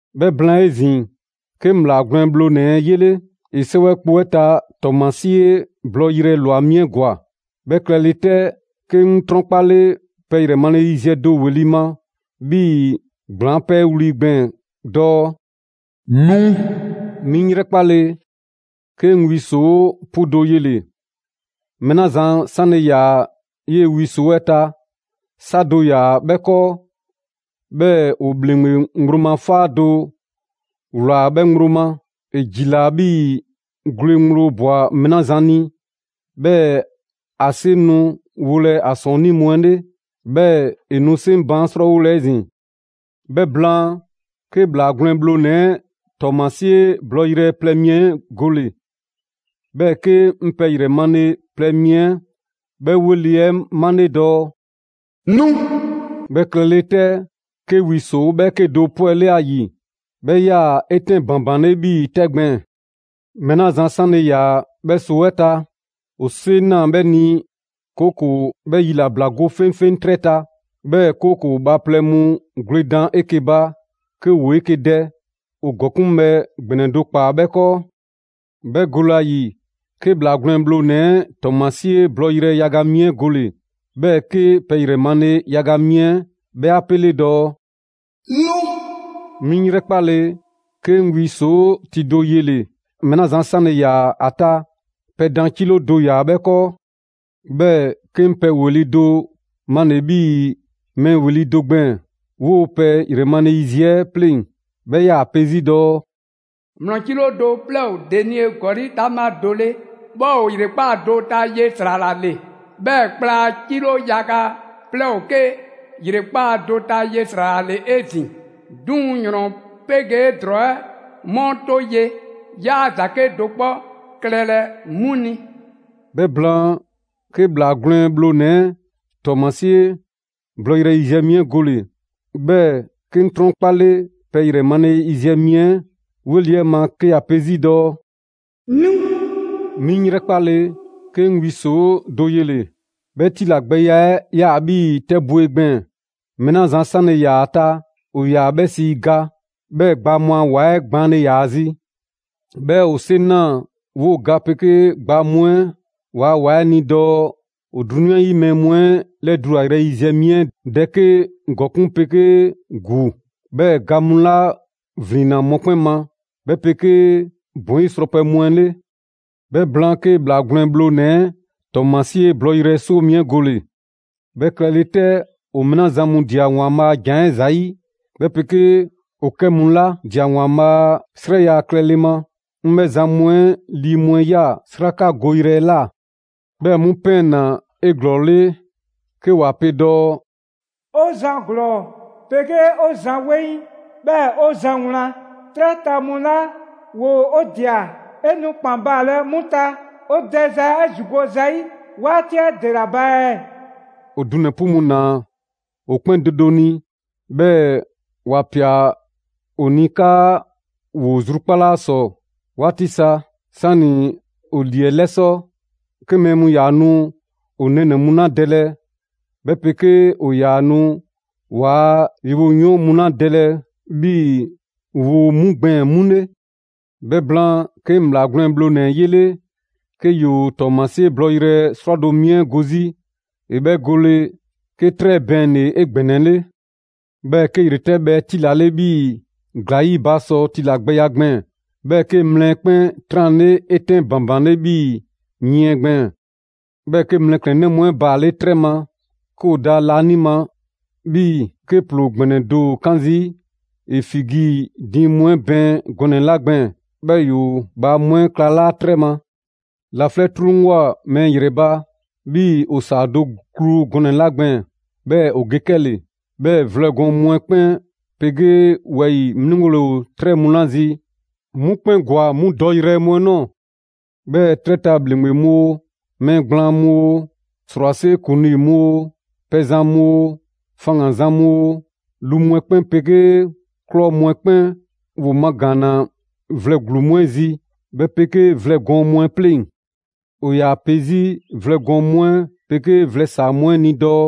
'Bhɛ blaan 'ezin‑, 'ke 'ŋ ‑Bhlaa Gwlɛn Bhlonɛ‑ 'ɛ 'yele. ‑E 'sɛwɛ kpo 'ɛ ta ‑tɔɔmasie blɔɔyrɛ ꞊lwa mi 'ɛ ‑gwa. 'Bhɛ klɛle 'tɛ, 'ke 'ŋ 'trɔnkpale pɛ ‑yrɛ male yiziɛ 'ɛ do ‑weli' ma 'bhii‑ ‑gblaŋ 'pɛɛ wli gbɛɛn‑ dɔɔ: «Nu!» 'Mi 'ŋ 'yrɛkpale, 'ke 'ŋ wi ‑soo' 'pu do yele‑. Mɛɛ 'la zan 'sanle‑ ‑yaa 'yee‑ wi ‑soo' 'ɛ ta, 'sa do ‑yaa 'bhɛ 'kɔɔ; 'bhɛɛ‑ ‑o ‑bhleŋgbe ŋgblo ma 'faa do ‑wlaa 'bhɛ ŋgblo ma. ‑E ‑jilaa 'bhii‑ gwle ŋgblo ꞊bwa mɛɛ 'la zan ni, 'bhɛɛ‑ ‑a 'seŋ nu wolɛ ‑a ‑sɔɔnnii' mu 'ɛ 'le, 'bhɛɛ‑ ‑e nu 'seŋ baan' 'srɔɔwolɛ 'ezin‑. 'Bhɛ blaan, 'ke ‑Bhlaa Gwlɛn Bhlonɛ 'ɛ ‑tɔɔmasie blɔɔyrɛ plɛ mi 'ɛ gole‑. 'Bhɛɛ‑ 'ke 'ŋ pɛ ‑yrɛ male plɛ mi 'ɛ 'bhɛ 'weli‑ 'ɛ male‑ dɔɔ: «Nu!» 'Bhɛ klɛle 'tɛ, 'ke wi ‑soo' 'bhɛɛke do 'pwɛle 'a ‑yi: 'Bhɛ 'yaa‑ 'etɛn ‑banbanle 'bhii‑ 'tɛ gbɛɛn‑. Mɛɛ 'la zan 'sanle‑ ‑yaa 'bhɛ ‑soo' 'ɛ ta, ‑o 'seŋ ꞊naa 'bhɛ ni, 'kooko‑ 'bhɛ yilabla go 'feŋfeŋ 'trɛ ta, 'bhɛɛ‑ 'kooko‑ bhaaplɛŋ mu gwledan 'eke‑ ba 'ke ‑woo 'eke‑ dɛ. ‑O ‑gɔkuŋbhɛ ‑gbɛnɛ do ‑kpaa 'bhɛ 'kɔɔ. 'Bhɛ gole ‑a ‑yi, 'ke ‑Bhlaa Gwlɛn Bhlonɛ‑ 'ɛ ‑tɔɔmasie blɔɔyrɛ yaga mi 'ɛ gole‑. 'Bhɛɛ‑ 'ke pɛ ‑yrɛ male yaga mi 'ɛ 'bhɛ 'a 'pele dɔɔ: «Nu!» 'Mi 'ŋ 'yrɛkpale, 'ke 'ŋ wi ‑soo' ti do yele‑. Mɛɛ 'la zan 'sanle‑ ‑yaa ‑a ta, pɛ dan 'kilo do ‑yaa 'bhɛ 'kɔɔ. 'Bhɛɛ‑ 'ke 'ŋ pɛ ‑weli' do male‑ 'bhii‑ mɛɛ ‑weli' do gbɛɛn‑ 'woo‑ pɛ ‑yrɛ male yiziɛ 'ɛ 'pleŋ‑. 'Bhɛ 'yaa‑ pe 'zi dɔɔ: «‑Mlɔ 'kilo do 'plɛɛ ‑o denie ‑gɔli' 'taŋbha do 'le ('bhɛ ‑o ‑yrekpaa' do ta ye ‑sra ‑la ‑le). 'Bhɛɛ‑ kpla 'kilo yaga 'plɛɛ ‑o 'ke ‑yrekpaa' do ta ye ‑sra ‑la ‑le 'ezin‑. 'Duŋ‑ ‑yrɔn 'pegee ‑drɔɔ 'ɛ 'mu 'to ye, 'yaa ‑za 'kedo‑ 'kpɔ klɛlɛ 'mu ni.» 'Bhɛ blaan, 'ke ‑Bhlaa Gwlɛn Bhlonɛ‑ ‑e ‑tɔɔmasie blɔɔyrɛ yiziɛ mi 'ɛ gole‑, 'bhɛɛ‑ 'ke 'ŋ 'trɔnkpale pɛ ‑yrɛ male yiziɛ mi 'ɛ 'weli‑ 'ɛ ma 'ke ‑ya pe 'zi dɔɔ: «Nu!» 'Mi 'ŋ 'yrɛkpale, 'ke 'ŋ wi ‑soo' do yele‑: 'bhɛ tilagbɛya 'ɛ 'yaa‑ 'bhii‑ 'tɛbwe‑ gbɛɛn‑. Mɛɛ 'la zan 'sanle‑ ‑yaa ‑a ta ‑o ‑yaa 'bhɛ sii ga. 'Bhɛɛ‑ gbaa mu a ‑wa 'ɛ gbaanle ‑yaa ‑a zi. 'Bhɛɛ‑ ‑o 'seŋ ꞊naa 'woo‑ ga 'pegee gbaa mu a ‑wa 'ɛ ni dɔɔ ‑o 'drunyan 'yi mu 'ɛ 'lɛdulayrɛ yiziɛ mi 'ɛ dɛ 'ke ‑gɔkuŋ' 'pegee ‑gu, 'bhɛɛ‑ ga mu 'la 'yivlin‑ mɔkpɛn' ma, 'bhɛ 'pegee ‑bɔn 'yi srɔpɛ mu 'ɛ 'le. 'Bhɛ blaan, 'ke ‑Bhlaa Gwlɛn Bhlonɛ‑ 'ɛ ‑tɔɔmasie blɔɔyrɛ 'soo mi 'ɛ gole‑. 'Bhɛ klɛle 'tɛ, ‑o mɛɛ 'la zan mu ꞊dia ‑Waanbhaa' a ‑Jan 'ɛ ‑zayi', 'bhɛ 'pegee ‑o 'kɛ 'mu 'la ꞊dia ‑Waanbhaa' a 'srɛya‑ klɛle ma, 'ŋ 'bhɛ zan mu 'ɛ lii mu 'ɛ ꞊ya 'srakagoyrɛ 'ɛ ꞊la. 'Bhɛ mu ‑pɛɛnna 'eglɔɔle 'ke ‑wa pe dɔɔ: «'O Zan ‑glɔɔ 'pegee 'o Zan 'weŋ, 'bhɛɛ‑ 'o Zan wlan, 'trɛ ta mu 'la ‑woo' 'o ꞊dia, 'e nu ‑kpan baalɛ 'mu ta 'o dɛza 'ɛ ‑zigo' zayi' 'waati 'ɛ ‑dela ba ɛɛ?» ‑O dunɛ‑ 'pu mu ‑naa ‑o 'kpɛn do do ni, 'bhɛɛ‑ ‑wa ꞊pia ‑o ni 'kaa‑ ‑woo zrubakpala ‑sɔ 'waati sa, 'sani‑ ‑o ‑lii 'ɛ 'lɛsɔ‑ 'ke mɛɛ mu ‑yaa nu ‑o nɛɛnɛ‑ mu 'la dɛlɛ 'bhɛ 'pegee ‑o ‑yaa nu ‑waa' yewoyɔɔn mu 'la dɛlɛ 'bhii‑ 'woo‑ mu gbɛɛn‑ 'mu 'le. 'Bhɛ blaan, 'ke 'ŋ ‑Bhlaa Gwlɛn Bhlonɛ‑ 'ɛ 'yele 'ke ‑yoo ‑tɔɔmasie blɔɔyrɛ 'srwado‑ mi 'ɛ go 'zi. ‑E 'bhɛ gole, 'ke 'trɛ 'ɛ bɛɛnle‑ 'egbɛnɛle. 'Bhɛɛ‑ 'ke ‑yretɛbhɛ 'ɛ 'tilale 'bhii‑ ‑gla ‑yi ba sɔ tilagbɛya gbɛɛn‑; 'bhɛɛ‑ 'ke mlɛ 'ɛ 'kpɛn 'tranle 'etɛn ‑banbanle 'bhii‑ yiɛn gbɛɛn‑. 'Bhɛɛ‑ 'ke mlɛklɛnnɛ mu 'ɛ baale' 'trɛ ma, 'ke ‑o da laanima 'bhii‑ 'ke ‑ploo ‑gbɛnɛ do ‑o 'kan zii' ‑e figi diiŋ mu 'ɛ bɛɛn gɔnɛ‑ 'la gbɛɛn‑, 'bhɛɛ‑ ‑yoo bhaa mu 'ɛ 'klalaa 'trɛ ma. Laflɛ' 'truŋwoa꞊ mɛɛ ‑yrɛ ba, 'bhii‑ ‑o ‑saa do klu gɔnɛ‑ 'la gbɛɛn‑, 'bhɛɛ‑ ‑o ge 'kɛle‑. 'Bhɛɛ‑ vlɛ gɔɔn mu 'ɛ 'kpɛn 'pegee wɛyi‑ 'mliŋgole ‑o 'trɛ mu 'la zi, 'mu 'kpɛn ‑gwa 'mu dɔyrɛ mu 'ɛ ꞊nɔɔ. 'Bhɛɛ‑ 'trɛ ta ‑bhleŋgbe mu oo, mɛɛ gblaan mu oo, ‑srwase' ‑kuŋlii mu oo, pɛzan mu oo, faŋgan‑ zan mu oo, lu mu 'ɛ 'kpɛn 'pegee ꞊klɔ mu 'ɛ 'kpɛn ‑woo magaanna vlɛ ‑gluu mu 'ɛ zi, 'bhɛ 'pegee vlɛ gɔɔn mu 'ɛ 'pleŋ‑. ‑O ‑yaa pe 'zi vlɛ gɔɔn mu 'ɛ 'pegee vlɛ ‑saa mu 'ɛ ni dɔɔ: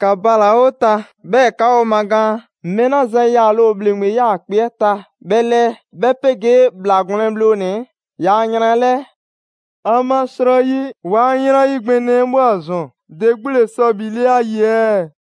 «‑Ka bala‑ 'o ta, 'bhɛɛ‑ 'ka 'o magaan mɛɛ 'la zan yaale ‑o ‑bhleŋgbe 'yaakpe‑ 'ɛ ta 'bhɛ 'lɛɛ, 'bhɛ 'pegee ‑Bhlaa Gwlɛn Bhlonɛ‑ 'ɛ ‑yaa' yran 'ɛ 'lɛɛ. ‑Amasrɔyi ‑waa' yran yi ‑gbɛnɛ 'ɛ ꞊bhwa ‑zɔn. ‑De 'gbu ‑le sɔ ‑bhile' ‑a ‑yi ɛɛ?»